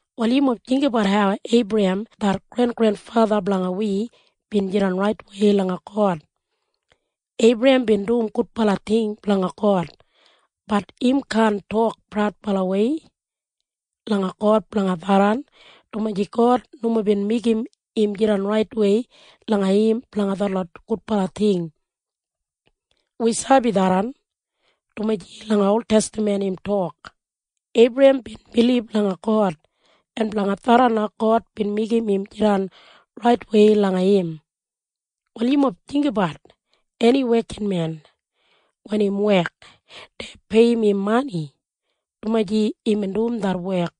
Wal yumob jinggabat hau Eibrahem det grengrenfatha blanga wi bin jidan raitwei langa God. Eibrahem bin dum gudbala ting blanga God. Bat im kaan tok praudbalawei langa God blanga tharran, dumaji God nomo bin meigim im jidan raitwei langa im blanga detlot gudbala ting. Wi sabi tharran, dumaji langa oltestaman im tok, “Eibrahem bin bilib langa God, en blanga tharran na God bin meigim im jidan raitwei langa im.” Wal yumob jinggabat eni wekinmen. Wen im wek, dei peiyim im mani, dumaji imbin dum det wek.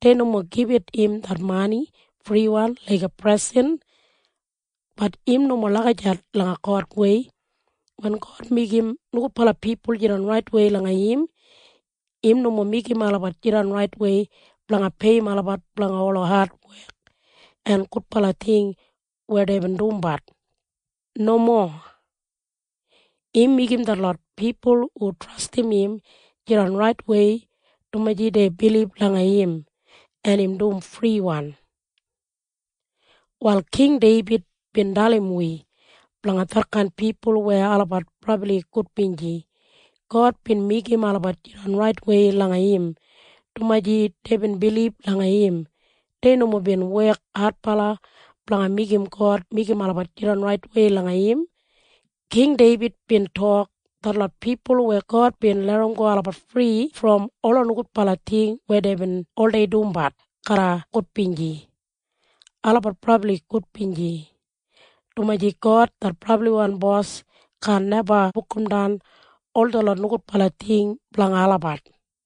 Dei nomo gibit im det mani friwan laiga presen. Bat im nomo lagijat langa Godwei. Wen God meigim nogudbala pipul jidan raitwei langa im, im nomo meigim olabat jidan raitwei blanga peiyim olabat blanga ola adwek en gudbala ting weya deibin dumbat. Nomo. Im meigim detlot pipul hu trastim im jidan raitwei dumaji dei bilib langa im. En im dum friwan. Wal King Deibid bin dalim wi blanga detkain pipul weya olabat brabli gudbinji. God bin meigim olabat jidan raitwei langa im, dumaji deibin bilib langa im. Dei nomo bin wek adbala blanga meigim God meigim olabat jidan raitwei langa im. King Deibid bin tok, “Detlot pipul weya God bin larramgo olabat fri brom ola nogudbala ting weya deibin oldei dumbat garra gudbinji. Olabat brabli gudbinji, dumaji God det brabliwan Bos kaan neba bukumdan ol detlot nogudbala ting blanga olabat.”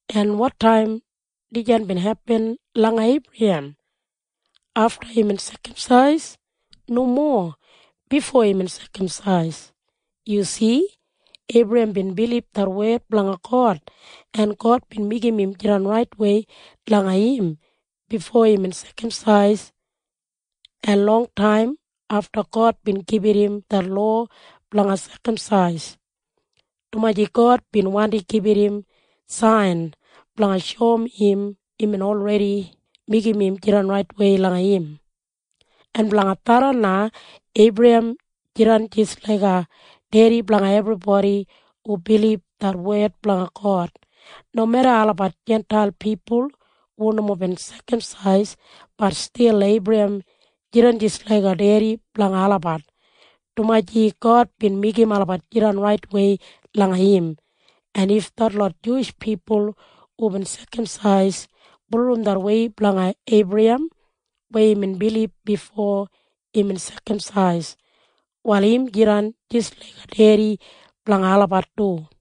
En wotaim dijan bin hepin langa Eibrahem? Afta imbin sekamsais? Nomo. Bifo imbin sekamsais. Yu si? Eibrahem bin bilib det wed blanga God, en God bin meigim im jidan raitwei langa im bifo imbin sekamsais, en longtaim afta God bin gibit im det lowa blanga sekamsais, dumaji God bin wandi gibit im sain blanga shoum im imbin olredi meigim im jidan raitwei langa im. En blanga tharran na Eibrahem jidan jis laiga dedi blanga ebribodi hu bilib det wed blanga God. Nomeda olabat Jintail pipul hu nomo bin sekamsais, bat stil Eibrahem jidan jis laiga dedi blanga olabat, dumaji God bin meigim olabat jidan raitwei langa im. En if detlot Juwish pipul hubin sekamsais bulurrum det wei blanga Eibrahem weya imbin bilib bifo imbin sekamsais, wal im jidan jis laiga dedi blanga olabat du.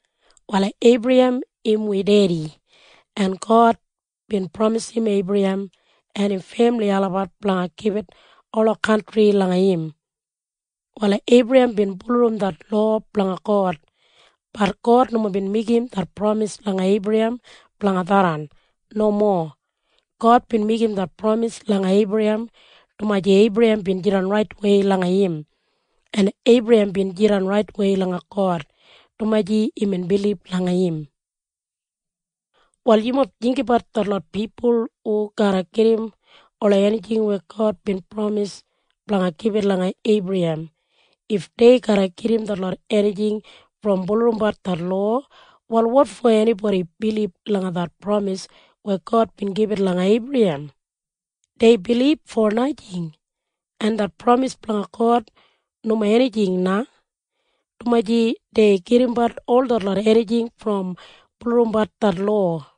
Wal Eibrahem im wi dedi, en God bin pramisim Eibrahem en im femili olabat blanga gibit ola kantri langa im. Wal Eibrahem bin bulurrum det lowa blanga God. Bat God nomo bin meigim det pramis langa Eibrahem blanga tharran. Nomo. God bin meigim det pramis langa Eibrahem dumaji Eibrahem bin jidan raitwei langa im. En Eibrahem bin jidan raitwei langa God, dumaji imbin bilib langa im. Wal yumob jinggabat detlot pipul hu garra gedim ola enijing weya God bin pramis blanga gibit langa Eibrahem. If dei garra gedim detlot enijing brom bulurrumbat det lowa, wal wotfo enibodi bilib langa det pramis weya God bin gibit langa Eibrahem? Dei bilib fo najing, en det pramis blanga God nomo enijing na, dumaji dei gedimbat ol detlot enijing brom bulurrumbat det lowa.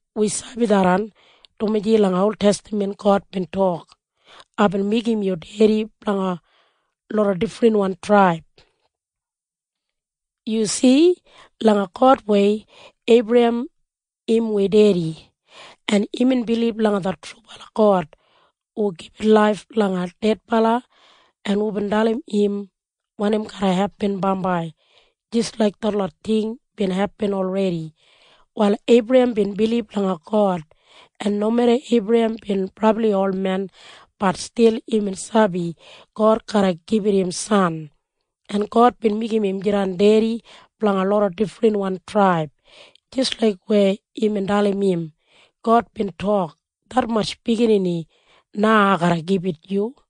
Wi sabi tharran, dumaji langa oltestaman God bin tok, “Aibin meigim yu dedi blanga loda difrinwan traib.” Yu si? Langa Godwei, Eibrahem im wi dedi, en imbin bilib langa det trubala God hu gibit laif langa dedbala en hubin dalim im wanim garra hepin bambai jis laik detlot ting bin hepin olredi. Wal Eibrahem bin bilib langa God, en nomeda Eibrahem bin brabli olmen, bat stil imbin sabi God garra gibit im san, en God bin meigim im jidan dedi blanga loda difrinwan traib jis laik weya imbin dalim im. God bin tok, “Detmatj biginini na ai garra gibit yu.”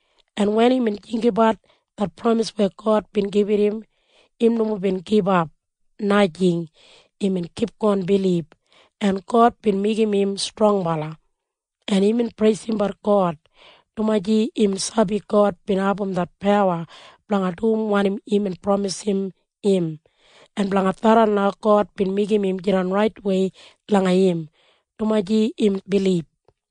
en wen imbin jinggabat det pramis weya God bin gibit im, im nomo bin gibap. Najing. Imbin kipgon bilib, en God bin meigim im strongbala, en imbin preisimbat God, dumaji imbin sabi God bin abum det pawa blanga dum wanim imbin pramisim im, en blanga tharran na God bin meigim im jidan raitwei langa im, dumaji imbin bilib.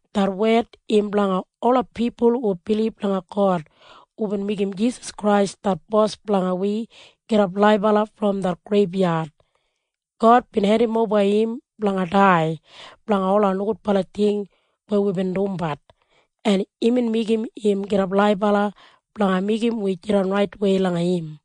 Det wed im blanga ola pipul hu bilib langa God hubin meigim Jisas Krais det Bos blanga wi gidap laibala brom det greibyad. God bin hendimoba im blanga dai blanga ola nogudbala ting weya wibin dumbat, en imbin meigim im gidap laibala blanga meigim wi jidan raitwei langa im.